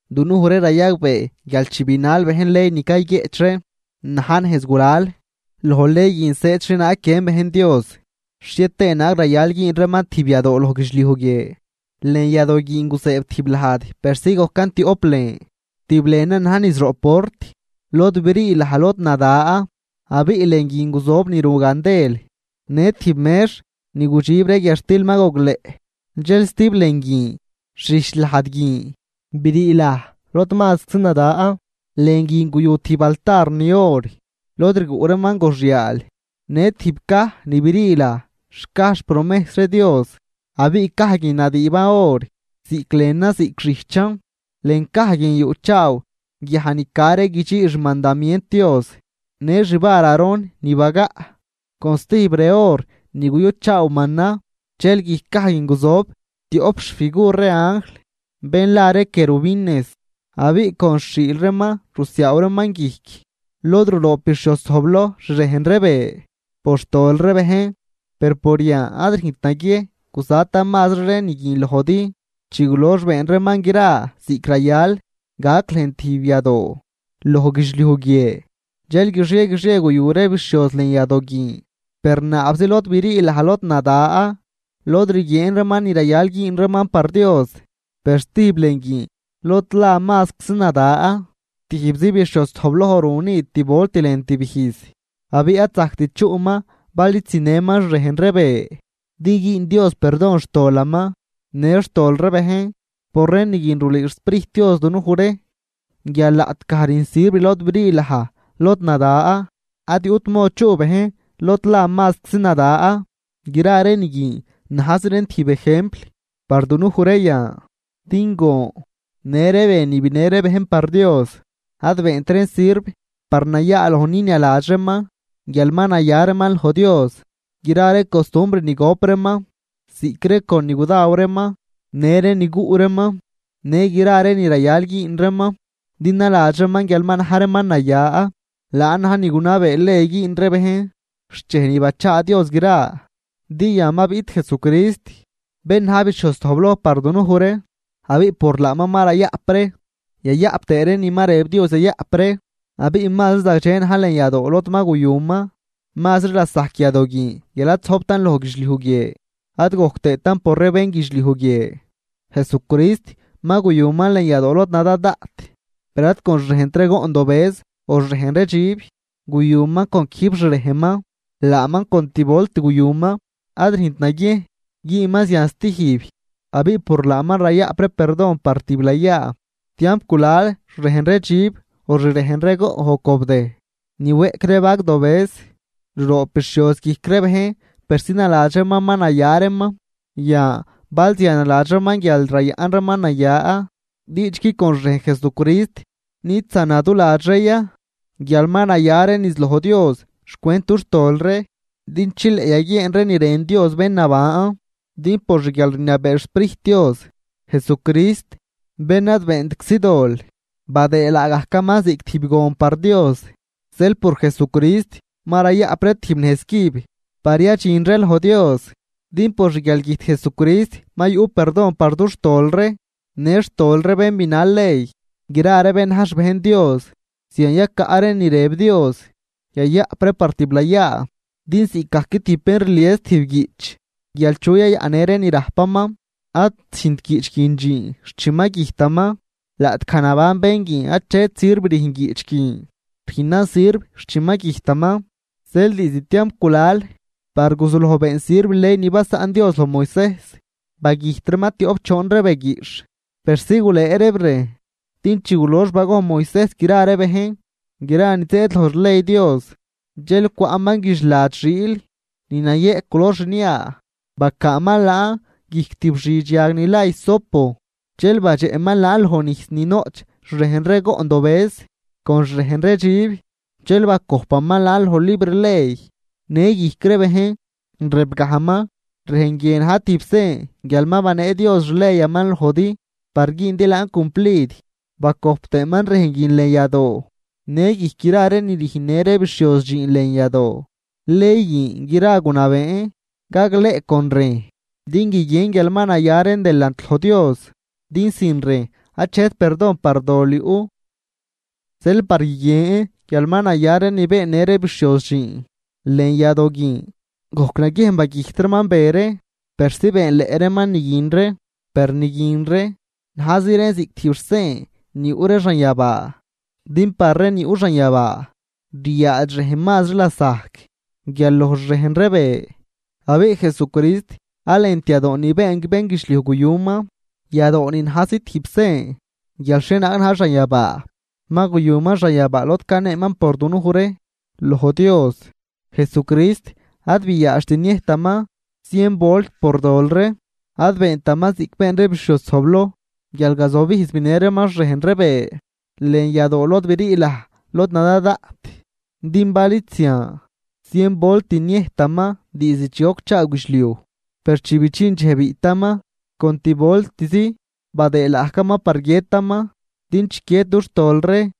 Dunuj ree rayagbee guial chi binal bejn ley ni cayguieꞌch ree na̱j nejz gulal, loj ley guin zëëd xhienaag guiën bejn Dios, xhie tëë naag rayal güün reeman tijb yadoo loj guidxliuj guie. Lën yadoo guin guzëëb tijb lajd persi gojcan tioꞌp lën. Tijb lënan ni na̱j niz roꞌ port, lod brii laj lod nada abiꞌ lën guin guzojb ni ru gandel në tijb mex ni gudxib ree guiadxtil ma gogleꞌ. Dxel stijb lën guin xijch lajd guin brii laj lod mazczi nada. Lën guin guyu tijb altar ni or lod rguꞌ reeman goxyal në tijb caj ni brii laj xcaj xpromejs ree Dios. Abiꞌ caj guin nadüüban or ziꞌc lënan ziꞌc xijchan. Lën caj guin yuꞌchaaw guiaj ni ca ree guidxii xmandamient Dios në xvar Aarón ni bagaꞌ con stijb re or ni guyuchaaw mana. Dxel guijc caj guin guzojb tioꞌp xfigur ree anjl bén la ree querubines abiꞌ con xhiil reeman rusiaaw reeman guijc lod ruroob bixhioz zojbloj xrejn ree be por xtol ree bejn. Per por yan ad rüjnt naguiejn guzatan mazri ree ni guin lojdi. Chi gulox been reeman gra ziꞌc rayal gac lën tijb yadoo loj guidxliuj guie, dxel guixie guixie guyu ree bixhioz lën yadoo guin per naabzi lod brii laj lod nada, lod rguieen reeman ni rayal güün reeman par Dios. Per stijb lën guin lod la mazcsi nada, tijbzi bixhioz zojbloj ru ni tib volt lën tib ijz. Abiꞌ ad zajct chuꞌman bal id zinëman xrejn ree be din güün Dios perdon xtolaman në xtol ree bejn. Por ree ni guin rulüü xSprijt Dios dunuj ree guial laꞌtgaj rüjn sirv lod brii laj lod nada ad yuꞌt mod chuꞌ bejn lod la mazcsi nada. Gra ree ni guin najzi reen tijb ejempl par dunuj ree yan, din gon në ree be ni binë ree bejn par Dios, ad beent reen sirv par nayaaloj ninialadx reeman guial ma naya reeman loj Dios. Gra ree costumbr ni gop reeman ziꞌc ree con ni gudaw reeman, në ree ni guꞌ reeman në gra ree ni rayal güün reeman din naladx reeman guial ma na̱j reeman naya, laan na̱j ni gunabee ley güün ree bejn xt dxej ni bachaa Dios gra. Din yan ma biꞌt Jesucrist, bén na̱j bixhioz zojbloj par dunuj ree, abiꞌ por laaman ma rayaꞌp ree yayaꞌp tëë ree ni ma rëb Dios yayaꞌp ree. Abiꞌ mazri zagdxe na̱j lën yadoo lod ma guyuman mazri lasajc yadoo guin guial ad zojbtan loj guidxliuj guie ad gojc tëëtan por ree bénguidxliuj guie. Jesucrist ma guyuman lën yadoo lod nada daꞌt, per ad con xrejnt ree goꞌn dobëz o xrejn ree dxib, guyuman con quijb xrejnman. Laaman con tib volt guyuman, ad rüjnt naguiejn güünman zian stijb abiꞌ por laaman rayaꞌp ree perdon par tiblayaa. Tiamp gulal xrejn ree dxib o xrejn ree goꞌn o cobdëj ni weꞌc ree vagdobëz ruroob bixhioz guijc ree bejn persi naladx reeman ma naya reeman. Yan bal zian naladx reeman guial rayaꞌn reeman naya, diidxgui con xrejn Jesucrist nid zanaduladx ree ya guial ma naya ree niz loj Dios xcwent dux tol ree, din chileꞌ yaguieen ree ni rën Dios bén naban. Din por xguialrniabee xSprijt Dios, Jesucrist bén ad beentczi dol, badëë laagajcaman ziꞌc tijb gon par Dios. Zeel por Jesucrist ma rayaꞌp ree tijb nejz cüb par yadxin ree loj Dios. Din por xguialgüjt Jesucrist ma yuꞌ perdon par dux tol ree në xtol ree bén ni binal ley, gra ree bén na̱j xbejn Dios zian yacaꞌ ree ni rëb Dios yayaꞌp ree par tiblayaa. Din ziꞌcgajc tijb bén rlies tijb guiꞌch guial chu yayaꞌnnë ree ni rajpaman, ad züjnt guiꞌch guin dxiin xt chi ma güjtaman. Laꞌtgaj naban bén guin achet sirv rüjn guiꞌch guin, rüjnan sirv xt chi ma güjtaman. Zeel diizd tiamp gulal par guzuloj been sirv ley ni basaꞌn Dios loj Moisejs, bagüjt reeman tioꞌp choon ree be guiꞌxh persi gulëë reeb rejn. Din chi gulox bagojn Moisejs gra ree bejn gra ni zëëd loj xley Dios dxel cwaꞌman guidxlad xiil ni nayëꞌ culor xnia bacaaman laan guijc tib xidx yag ni la hisopo, dxel badxeꞌman laan loj nijs ni noꞌch xrejn ree goꞌn dobëz con xrejn ree dxib dxel bacojpaman laan loj libr ley në guijc ree bejn rëbgajman: “Rejn guie na̱j tijb sen guial ma banee Dios xleyaman lojdi par güündi laan cumplid.” Bacojp tëëman rejn guin lën yadoo në guijc gra ree ni rüjnnë ree bixhioz dxiin lën yadoo. Ley guin gra gunabeen gagleꞌ con rejn din guiguien guial ma naya reen delant loj Dios, din sin rejn achet perdon par dol yuꞌ. Zeel par guiguien guial ma naya ree ni beennë ree bixhioz dxiin lën yadoo guin, gojc naguiejn bagüjt reeman be ree persi beenleꞌ reeman ni guin ree. Per ni guin ree najzi reen ziꞌc tijb xsen ni yuꞌ ree xanyabaa, din par ree ni yuꞌ xanyabaa ryaadx rejn mazri lasajc guial loj xrejn ree be. Abiꞌ Jesucrist ad lënt yadoo ni been bénguidxliujn guyuman, yadoo ni najzi tijb sen guial xhienaag na̱j xanyabaa, ma guyuman xanyabaa lod caneeman por dunuj ree loj Dios. Jesucrist ad biaadxt niëjtaman zien volt por dol ree, ad beentaman ziꞌc been ree bixhioz zojbloj guial gazobijz binë reeman xrejn ree be lën yadoo lod brii laj lod nada daꞌt. Din bal id zian, zien volt niëjtaman diizd chi gocchaaw guidxliuj. Per chi bidxin dxej biꞌtaman, con tib voltzi badëë laagajcaman par guiëtaman din chiquied dux tol ree.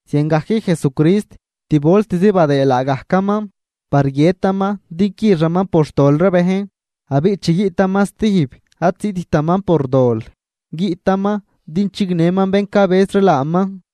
Ziangajc Jesucrist tib voltzi badëë laagajcaman par guiëtaman din quixaman por xtol ree bejn. Abiꞌ chi guiꞌtaman stijb ad ziꞌttaman por dol, guiꞌtaman din chignëman bén cabëz ree laaman.